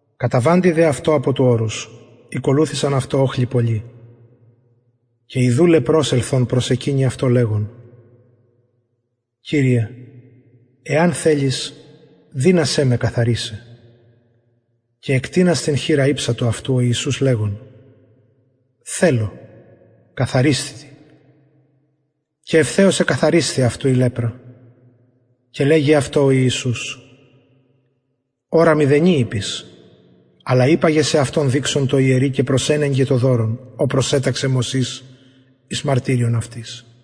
καταβαντι δε αυτω απο του ορους ηκολουθησαν αυτω οχλοι πολλοι και ιδου λεπρος ελθων προσεκυνει αυτω λεγων κυριε εαν θελης δυνασαι με καθαρισαι και εκτεινας την χειρα ηψατο αυτου ο ιησους λεγων θελω καθαρισθητι και ευθεως εκαθαρισθη αυτου η λεπρα και λεγει αυτω ο ιησους ορα μηδενι ειπης αλλα υπαγε σεαυτον δειξον τω ιερει και προσενεγκε το δωρον ο προσεταξεν μωσης εις μαρτυριον αυτοις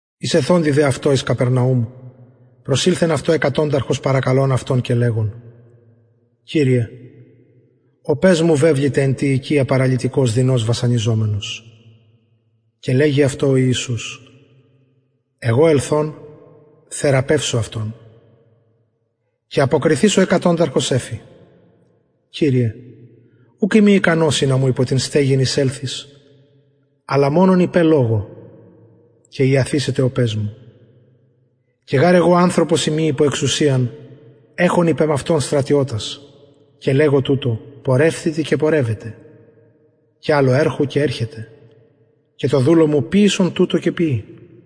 εισελθοντι δε αυτω εις καπερναουμ προσηλθεν αυτω εκατονταρχος παρακαλων αυτον και λεγων κυριε ο παις μου βεβληται εν τη οικια παραλυτικος δεινως βασανιζομενος και λεγει αυτω ο ιησους εγω ελθων θεραπευσω αυτον και αποκριθεις ο εκατονταρχος εφη κυριε ουκ ειμι ικανος ινα μου υπο την στεγην εισελθης αλλα μονον ειπε λογω και ιαθησεται ο παις μου και γαρ εγω ανθρωπος ειμι υπο εξουσιαν εχων υπ εμαυτον στρατιωτας και λεγω τουτω πορευθητι και πορευεται και αλλω ερχου και ερχεται και τω δουλω μου ποιησον τουτο και ποιει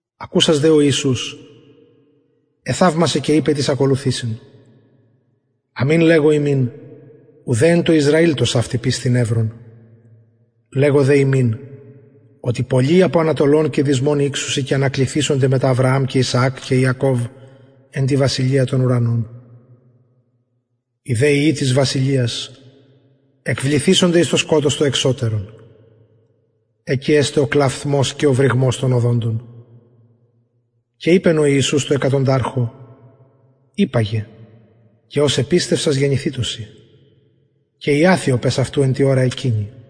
ακουσας δε ο ιησους εθαυμασεν και ειπεν τοις ακολουθουσιν αμην λεγω υμιν ουδε εν τω ισραηλ τοσαυτην πιστιν ευρον λεγω δε υμιν οτι πολλοι απο ανατολων και δυσμων ηξουσιν και ανακλιθησονται μετα αβρααμ και ισαακ και ιακωβ εν τη βασιλεια των ουρανων οι δε υιοι της βασιλειας εκβληθησονται εις το σκοτος το εξωτερον εκει εσται ο κλαυθμος και ο βρυγμος των οδοντων και ειπεν ο ιησους τω εκατονταρχη υπαγε και ως επιστευσας γενηθητω σοι και ιαθη ο παις αυτου εν τη ωρα εκεινη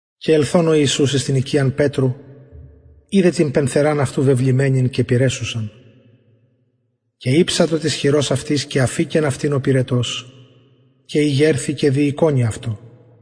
και ελθων ο ιησους εις την οικιαν πετρου ειδεν την πενθεραν αυτου βεβλημενην και πυρεσσουσαν και ηψατο της χειρος αυτης και αφηκεν αυτην ο πυρετος και ηγερθη και διηκονει αυτω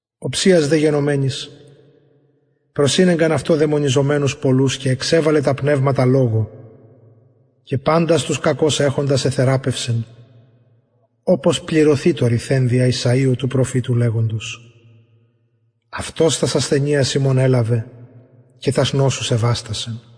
οψιας δε γενομενης προσηνεγκαν αυτω δαιμονιζομενους πολλους και εξεβαλεν τα πνευματα λογω και παντας τους κακως εχοντας εθεραπευσεν οπως πληρωθη το ρηθεν δια ησαιου του προφητου λεγοντος αυτος τας ασθενειας ημων ελαβεν και τας νοσους εβαστασεν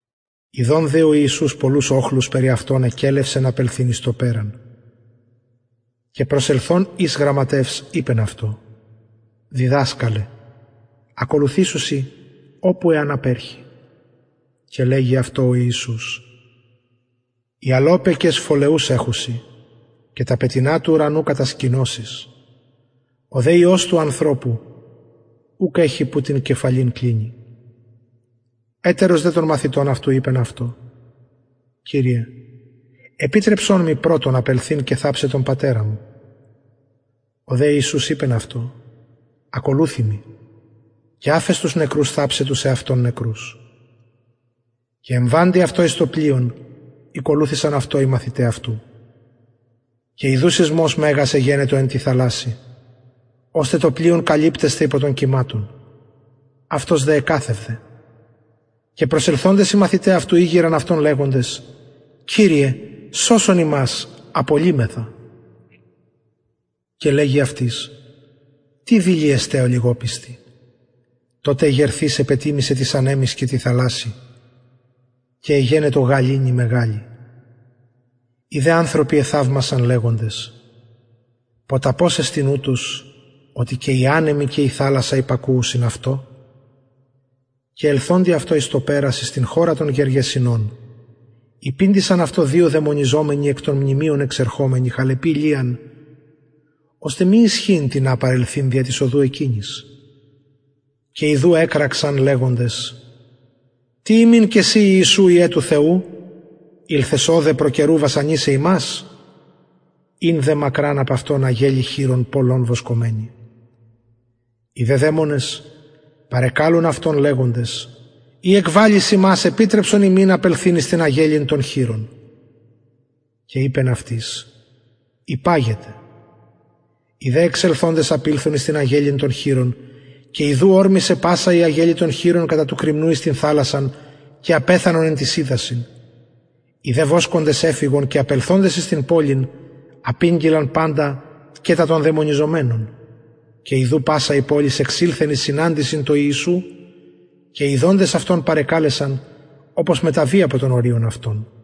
ιδων δε ο ιησους πολλους οχλους περι αυτον εκελευσεν απελθειν εις το περαν και προσελθων εις γραμματευς ειπεν αυτω διδασκαλε ακολουθησω σοι οπου εαν απερχη και λεγει αυτω ο ιησους αι αλωπεκες φωλεους εχουσιν και τα πετεινα του ουρανου κατασκηνωσεις ο δε υιος του ανθρωπου ουκ εχει που την κεφαλην κλινη ετερος δε των μαθητων αυτου ειπεν αυτω κυριε επιτρεψον μοι πρωτον απελθειν και θαψαι τον πατερα μου ο δε ιησους ειπεν αυτω ακολουθει μοι και αφες τους νεκρους θαψαι τους εαυτων νεκρους και εμβαντι αυτω εις το πλοιον ηκολουθησαν αυτω οι μαθηται αυτου και ιδου σεισμος μεγας εγενετο εν τη θαλασση ωστε το πλοιον καλυπτεσθαι υπο των κυματων αυτος δε εκαθευδεν και προσελθοντες οι μαθηται ηγειραν αυτον λεγοντες κυριε σωσον ημας απολλυμεθα και λεγει αυτοις τι δειλοι εστε ολιγοπιστοι τοτε εγερθεις επετιμησεν τοις ανεμοις και τη θαλασση και εγενετο γαληνη μεγαλη οι δε ανθρωποι εθαυμασαν λεγοντες ποταπος εστιν ουτος οτι και οι ανεμοι και η θαλασσα υπακουουσιν αυτω και ελθοντι αυτω εις το περαν εις την χωραν των γεργεσηνων υπηντησαν αυτω δυο δαιμονιζομενοι εκ των μνημειων εξερχομενοι χαλεποι λιαν ωστε μη ισχυειν τινα παρελθειν δια της οδου εκεινης και ιδου εκραξαν λεγοντες τι ημιν και σοι ιησου υιε του θεου ηλθες ωδε προ καιρου βασανισαι ημας ην δε μακραν απ αυτων αγελη χοιρων πολλων βοσκομενη οι δε δαιμονες παρεκαλουν αυτον λεγοντες ει εκβαλλεις ημας επιτρεψον ημιν απελθειν εις την αγελην των χοιρων και ειπεν αυτοις υπαγετε οι δε εξελθοντες απηλθον εις την αγελην των χοιρων και ιδου ωρμησεν πασα η αγελη των χοιρων κατα του κρημνου εις την θαλασσαν και απεθανον εν τοις υδασιν οι δε βοσκοντες εφυγον και απελθοντες εις την πολιν απηγγειλαν παντα και τα των δαιμονιζομενων και ιδου πασα η πολις εξηλθεν εις συναντησιν τω ιησου και ιδοντες αυτον παρεκαλεσαν οπως μεταβη απο των οριων αυτων